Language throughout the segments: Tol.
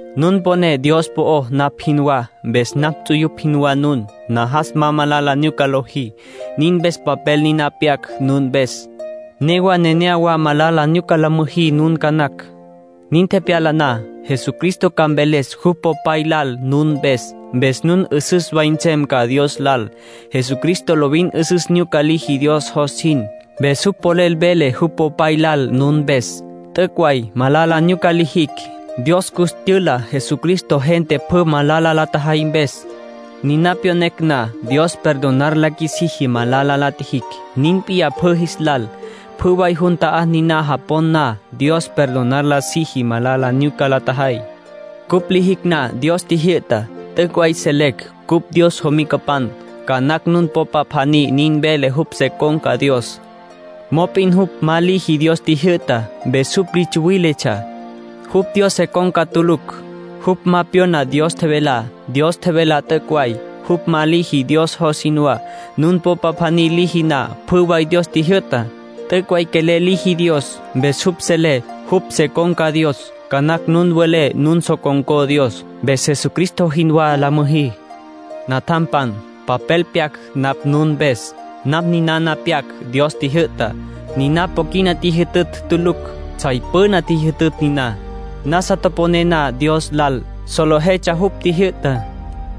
Nun poné Dios po'ó napj jinwá, mpes napj ts'uyupj jinwá nun. Najas ma malala nyuca lojí. Nin mpes papel niná pyac nun mpes. Newa nenéyawa malala nyuca ca la müjí nun ca nacj. Nin tepyala na, Jesucristo ca mveles jupj Popay lal nun mpes. Mpes nun 'üsüs way nsem ca Dios lal. Jesucristo lovin 'üsüs nyuca liji Dios jos jin. Mpes jupj polel vele jupj Popay lal nun mpes. T'üc' way malala nyuca lijicj. Dios cus tyüla Jesucristo gente pjü malala la tjajay mpes. Niná pyonecj na, Dios perdonar la qjuisiji malala la tjijicj. Nin p'iyá pjü jis lal. Pjü way jun ta'á niná japon na, Dios perdonar la siji malala nyuca la tjajay. Cupj lijicj na Dios tjijyü'tá, t'üc' way selecj cupj Dios jomicapan. Ca nacj nun popa pjaní nin vele jupj se con̈ca Dios. Mop'in jupj ma liji Dios tjijyü'tá. Mpes jupj li tsuwíletsja. Jupj Dios se con̈ca tulucj. Jupj ma pyona Dios tjevelá. Dios tjevelá t'üc' way. Jupj ma liji Dios jos jinwá. Nun popa pjaní liji na pjü way Dios tjijyü'tá, t'üc' way quelel liji Dios. Mpes jupj selé jupj se con̈ca Dios. Ca nacj nun welé nun so con̈có Dios. Mpes Jesucristo jinwá la müjí. Natjampan, papel pyac napj nun mpes. Napj ninana pyac Dios tjijyü'tá. Niná po quina tjijyü'ta tulucj. Tsjay püna tjijyü'ta niná. Nasa toponé na Dios lal, solejetsja jupj tjijyü'tá.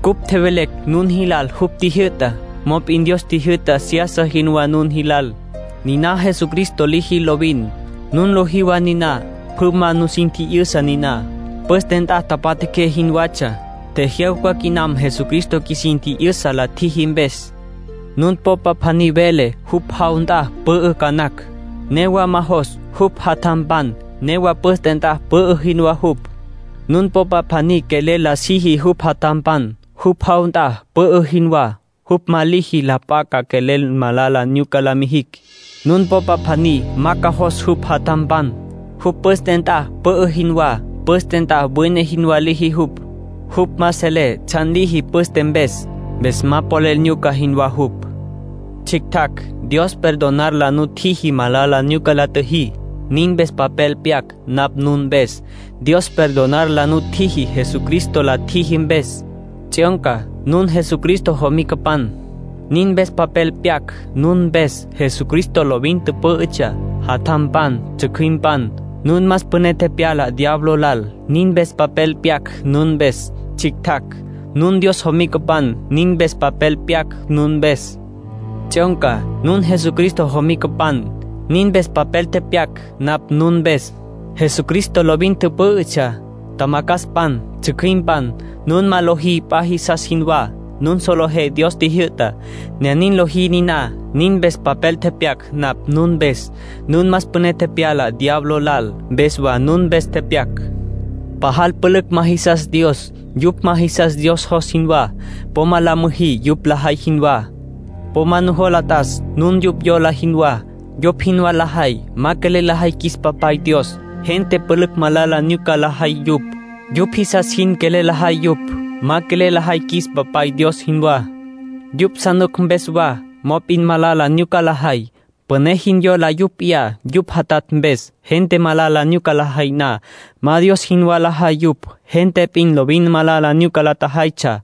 Cupj tjevelecj nun jilal jupj tjijyü'tá. Mop'in Dios tjijyü'ta seyasa jinwá nun jilal. Niná Jesucristo liji lovin. Nun lojí wa niná. Püna ma nusin tji'yüsa niná; püste nt'a tapatjaqué jinwatsja. Tjejyawca quinam Jesucristo qjuisin tji'yüsa la tjiji mpes. Nun popa pjaní vele jupj jaw nt'a pü'ü ca nacj, newa ma jos jupj jatjampan. Newa püste nt'a pü'ü jinwá jupj. Nun popa pjaní quelel la siji jupj jatjampan, jupj jaw nt'a pü'ü jinwá. Jupj ma liji la p'a ca quelel malala nyuca la mijicj. Nun popa pjaní ma jos jupj jatjampan, jupj püste nt'a pü'ü jinwá. Püste nt'a wine jinwá liji jupj. Jupj ma selé tsjan liji püste mpes. Mpes ma polel nyuca jinwá jupj. Tsjictjacj, Dios perdonar la nutjiji malala nyuca la tjüjí; nin mpes papel pyac napj nun mpes. Dios perdonar la nutjiji Jesucristo la tjiji mpes. Tsjyonca, nun Jesucristo jomicapan; nin mpes papel pyac nun mpes. Jesucristo lovin tüpǘ'ütsja. Tjamacjaspan, tsjücjüimpan, nun más püné tepyala diablo lal; nin mpes papel pyac nun mpes. Tsjictjacj, nun Dios jomicapan; nin mpes papel pyac nun mpes. Tsjyonca, nun Jesucristo jomicapan; nin mpes papel tepyac napj nun mpes. Jesucristo lovin tüpǘ'ütsja. Tjamacjaspan, tsjücjüimpan, nun ma lojí p'a jisas jinwá. Nun solejé Dios tjijyü'tá, ne nin lojí niná; nin mpes papel tepyac napj nun mpes. Nun más püné tepyala diablo lal, mpes wa nun mpes tepyac. Pajal pülücj ma jisas Dios. Yupj ma jisas Dios jos jinwá. Po ma la müjí yupj lajay jinwá. Po ma nujola t'as nun yupj yola jinwá. Yupj jinwá lajay ma quelel lajay qjuis Papay Dios. Gente pülücj malala nyuca lajay yupj. Yupj jisas jin quelel lajay yupj, ma quelel lajay qjuis Papay Dios jinwá. Yupj sa nuc mpes wa, mop'in malala nyuca lajay. Püné jin yola yupj p'iyá yupj jatatj mpes. Gente malala nyuca lajay na, ma Dios jinwá lajay yupj. Gente p'in lovin malala nyuca la tjajaytsja,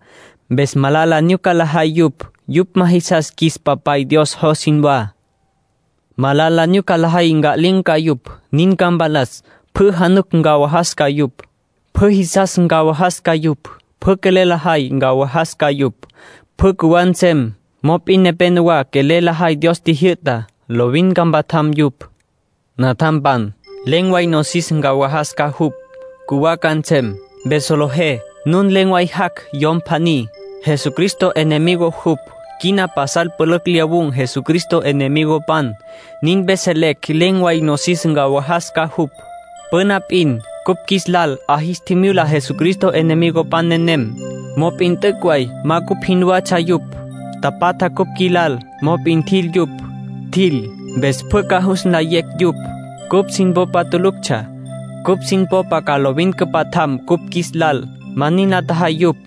mpes malala nyuca lajay yupj. Yupj ma jisas qjuis Papay Dios jos jinwá. Malala nyuca lajay nca'lin̈ ca yupj, nin ca mpalas. Pjü januc ncawajas ca yupj. Pjü jisas ncawajas ca yupj. Pjü quelel lajay, ncawajas ca yupj. Pjü cjuwá nsem. Mop'in nepénowa quelel lajay Dios tjijyü'tá; lovin ca mpatjam yupj. Natjampan, len̈ way nosis ncawajas ca jupj. Cjuwá ca nsem. Mpes solejé nun len̈ way jac' yom pjaní, Jesucristo enemigo jupj. Quina pasal pülücj lyawun̈ Jesucristo enemigopan. Nin mpes selecj len̈ way nosis ncawajas ca jupj. Püna p'in cupj qjuis lal 'a jis tjimyula Jesucristo enemigopan nenem. Mop'in t'üc' way ma cupj jinwatsja yupj. Tapatja cupj qjuilal, mop'in tjil yupj. Tjil, mpes pjü ca jus nlayecj yupj cupj sin popa tuluctsja. Cupj sin popa ca lovin cüpatjam cupj qjuis lal. Ma nin la tjajay yupj.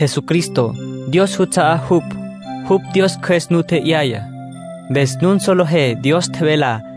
Jesucristo, Dios juts'a'á jupj; jupj Dios Cjües nu tje'yaya. Mpes nun solejé Dios tjevelá.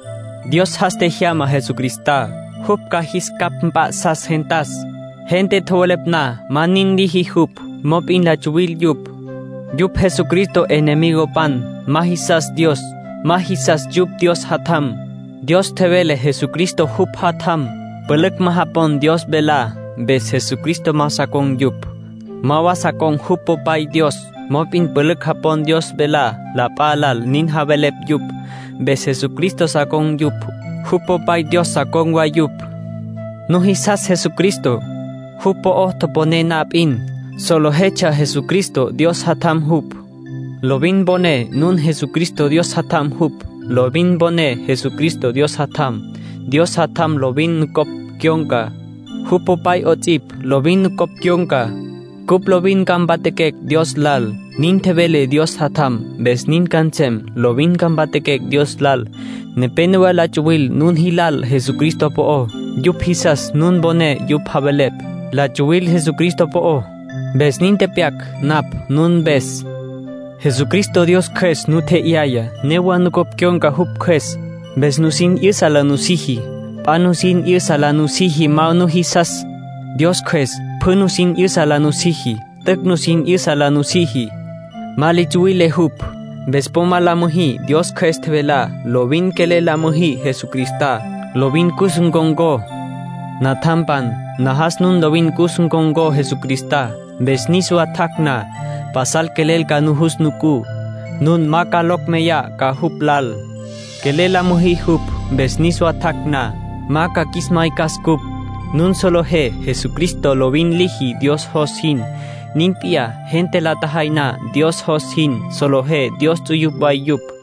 Dios jas tjejyama Jesucristá, jupj ca jis capj mp'a'sas gentas. Gente tjowelepj na ma nin liji jupj, mop'in la tsuwil yupj. Yupj Jesucristo enemigopan. Ma jisas Dios. Ma jisas yupj Dios Jatjam. Dios tjevele Jesucristo jupj Jatjam. Pülücj ma japon Dios velá. Mpes Jesucristo ma sa con̈ yupj, ma wa sa con̈ jupj Popay Dios. Mop'in pülücj japon Dios velá. La p'a lal nin javelepj yupj. Mpes Jesucristo sa con̈ yupj, jupj Popay Dios sa con̈ wa yupj. Nujisas Jesucristo. Jupj po'ó toponé na p'in, solejetsja Jesucristo Dios Jatjam jupj. ¡Lovin mponé nun Jesucristo Dios Jatjam jupj! Lovin poné Jesucristo Dios Jatjam, Dios Jatjam lovin nucopj cyon̈ca. Jupj Popay 'ots'ipj lovin nucopj cyon̈ca. Cupj lovin ca mpatjaquecj Dios lal, nin tjevele Dios Jatjam. Mpes nin ca nsem. Lovin ca mpatjaquecj Dios lal. Nepénowa la tsuwil nun jilal Jesucristo po'ó. Yupj jisas nun poné yupj javelepj. La tsuwil Jesucristo po'ó, mpes nin tepyac napj nun mpes. Jesucristo Dios Cjües nu tje'yaya. Newa nucopj cyon̈ca jupj Cjües, mpes nusin 'yüsa la nusiji. P'a nusin 'yüsa la nusiji ma nujisas. Dios Cjües pjü nusin 'yüsa la nusiji. T'üc' nusin 'yüsa la nusiji. Ma li tsuwile jupj. Mpes po la müjí Dios Cjües tjevelá. Lovin quelel la müjí Jesucristá. Lovin cus ncon̈có. Natjampan, najas nun lovin cus ncon̈có Jesucristá. Mpes niswa tjac' na, pasal quelel ca jus nucú. Nun ma locj meyá ca jupj lal. Quelel la müjí jupj. Mpes niswa tjac' na, ma ca qjuis maycas cupj. Nun solejé Jesucristo lovin liji Dios jos jin. Nin p'iyá, gente la tjajay na Dios jos jin, solejé Dios ts'uyupj way yupj.